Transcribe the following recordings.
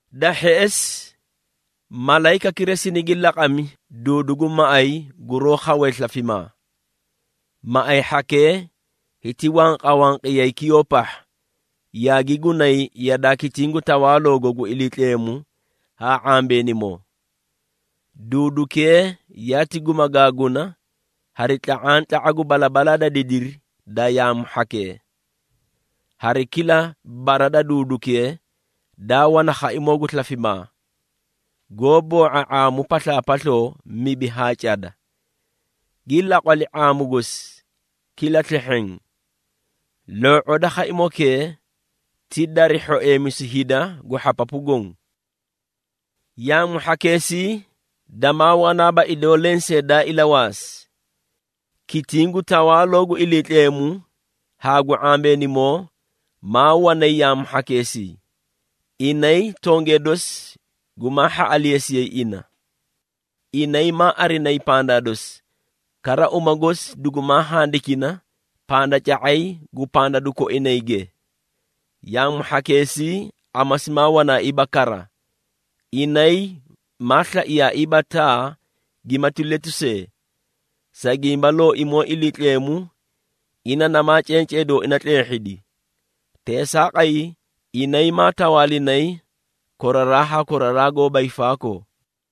Da hheꞌesi, malayikakira sinigi laqami duudu gu maꞌay guroó khawee slafimaa. Maꞌay hhakee hiti wanqawanqiyay kiyoo pahha, yaagi gunay yadaa kitiĩ gu tawaaloogo gu Iliitleemu haa ⁄ambeenimoo. Duudukee yaati gumagaaguna hari tla⁄antla⁄a gu balabalaa da didiri da yaamu hhakee. Hari kila bara da duudukee daa wana khaimoo gu slafimaa, goó boo⁄a ⁄aamu paslaapasloo mibi haa cada, gi laqwali ⁄aamu gosi kila slehheẽ. Loo⁄oo da khaimokee ti dari hhoeemisu hida gu hhapapu goõ. Yaamu hhakeesii damaa wanaaba idoo lensee daa ilawaasi. Kitiĩ gu tawaaloo gu Iliitleemu haa gu ⁄ambeenimoo maa wanay yaamu hhakeesii, inay tongee dosi gumaa hhaꞌaleesiyay ina. Inay maa arinayi pandaa dosi, kara uma gosi dugumaa handikina pandaca⁄ay gu pandadu koinayge. Yaamu hhakeesii amasi maa wanaaiiba kara, inay maa slaiyaaiiba taa gimati letu see, sa gimba Looimoo Iliitleemu, ina namaa cencee dooina tleehhidi. Teesaaqay, inay maa tawaalinay koraraa haa koraraa goóba hiifaakoo.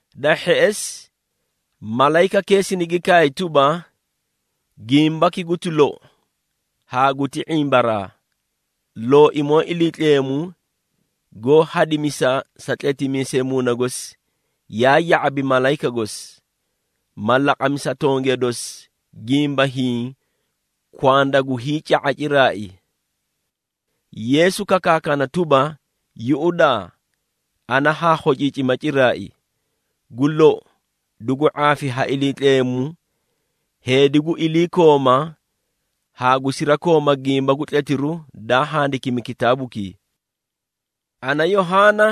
Da hheꞌesi, malayikakee sinigi kaay tuba, “Gimbaki guti lou haa guti ⁄imbaraa. Looimoo Iliitleemu goó hadimisa sa tletimiisee Muuna gosi, yaa ya⁄abi malayika gosi, ma laqami sa tongee dosi gimba hiĩ kwanda gu hiica⁄a ciraai.” Yeesu kakaakana tuba, “Yuꞌudaa ana haa khociicima ciraai! Gu lou, dugu ⁄aafi ha Iliitleemu heedi gu iliikooma haa gu sirakooma gimba gu tletiru daa handikimi kitaabukii.” Ana, Yohaana,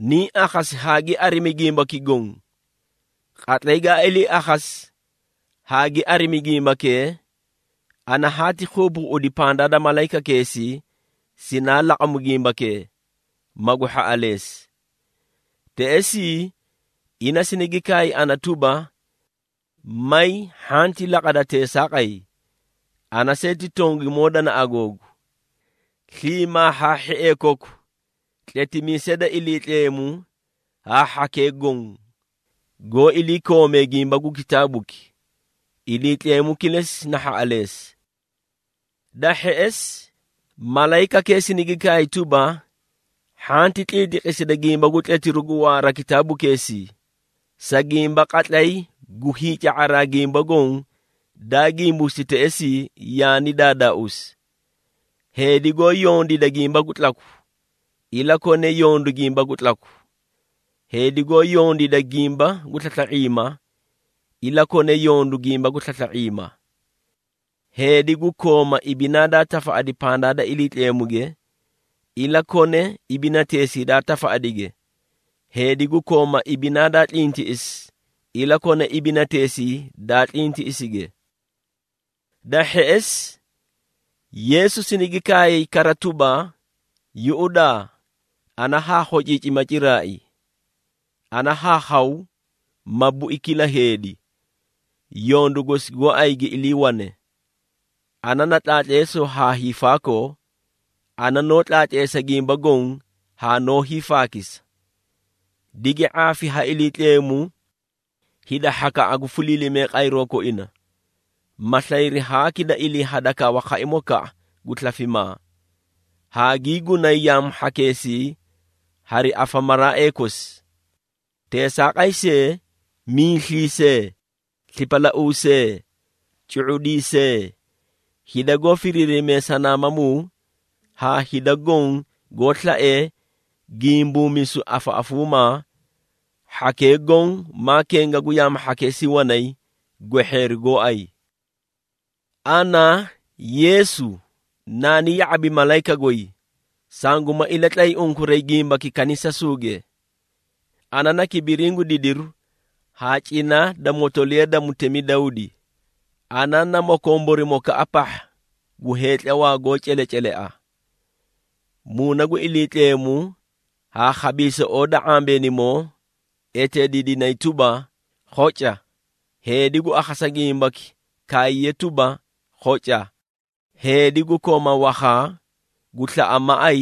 niĩ akhasi haa gi arimi gimbaki goõ. Qatlay gaa ilii akhasi haa gi arimi gimbakee, ana haati keebeeꞌedi pandaa da malayikakeesii sinaalaqamu gimbakee, magu hhaꞌaleesi. Teꞌesii, ina sinigi kaay ana tuba, “May hhanti laqada teesaaqay! Ana see ti tongimoo danaꞌa googu, sliimaa haa hhiee koku tletimiisee da Iliitleemu haa hhakee goõ, goó iliikoomee gimba gu kitaabuki. Iliitleemu kilesi na hhaꞌaleesi!” Da hheꞌesi, malayikakee sinigi kaay tuba, “Hhanti tliitliqisida gimba gu tletiru gu waara kitaabukeesii, sa gimba qatlay gu hiica⁄araa gimba goõ daa gimbuusi teꞌesii, yaani daadaauusi. Heedi goó yondiida gimba gu tlaku, ilakone yondu gimba gu tlaku, heedi goó yondiida gimba gu slasla⁄iima, ilakone yondu gimba gu slasla⁄iima. Heedi gu kooma ibinaa daa tafaꞌadi pandaa da Iliitleemuge, ilakone ibinateesii daa tafaꞌadige, heedi gu kooma ibinaa daa tlintiꞌisi ilakone ibinateesii daa tlintiꞌisige.” Da hheꞌesi, Yeesu sinigi kaay kara tuba, “Yuꞌudaa, ana haa khociicima ciraai! Ana haa khaw ma bui kila heedi, yondu gosi gooay gi iliiwane. Ana na Tlaatleesoo haa Hiifaakoo, ana noó tlaatleesa gimba goõ haa noó hiifaakisa. Digi ⁄aafi ha Iliitleemu hida hhakaꞌa gu fuliilimee qayroo koina, ma slayri haaki da iliihadakawa khaimokaꞌa gu slafimaa, haa gii gunay yaamu hhakeesii hari afamaraaee kosi. Teesaaqay see, miisliisee, slipalauusee, cu⁄udiisee, hida goó firiirimee sanaamamuu haa hida goõ goó slaee gimbuumisu afaꞌafuuma, hhakee goõ maa kenga gu yaamu hhakeesii wanay gwehheeri gooay. Ana, Yeesu, naani ya⁄abi malayika goy, sanguma ilatlay unkuray gimbaki kanisasuuge. Ana na kibiriĩ gu didiru haa cina da motoliya da mutemi Dawdi, ana na Mokomborimokaꞌa pahha gu heetlawaa goó celecelea.” Muuna gu Iliitleemu haa khabiisoꞌoo da ⁄ambeenimoo eteediidinay tuba, “Khoca! Heedi gu akhasa gimbaki kaayiye tuba, ‘Khoca!’ Heedi gu kooma wakhaa, gu slaꞌa maꞌay,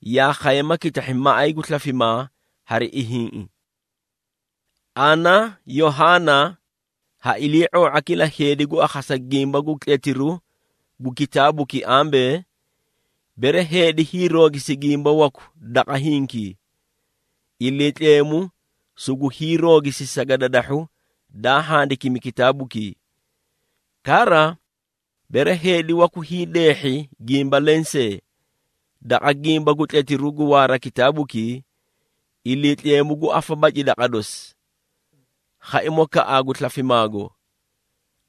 yaa khaye ma kitahhi maꞌay gu slafimaa hari ihiĩꞌi.” Ana, Yohaana, ha ilii⁄oo⁄a kila heedi gu akhasa gimba gu tletiru gu kitaabuki ambee, bere heedi hiiroogisi gimba waku daqa hinkii, Iliitleemu sugu hiiroogisi sagadadahhu daa handikimi kitaabukii. Kara, bere heedi waku hiideehhi gimba leẽ see, daqa gimba gu tletiru gu waara kitaabukii, Iliitleemu gu afabaci daqa dosi, khaimokaꞌaa gu slafimaago,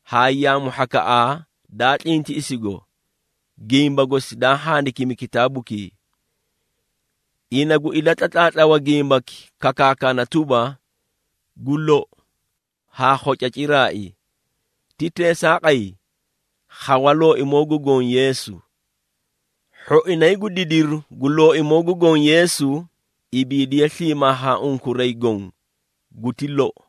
haa yaamu hhakaꞌaa daa tlintiꞌisigo, gimba gosi daa handikimi kitaabukii. Ina gu ilatlatlaatlawa gimbaki kakaakana tuba, “Gu lou, haa khoca ciraai!” Ti teesaaqay. Khawa Looimoo gu Goõ Yeesu! Hhoinay gu didiru gu Looimoo gu Goõ Yeesu, ibiidiye sliimaa haa unkuray goõ. Guti lou.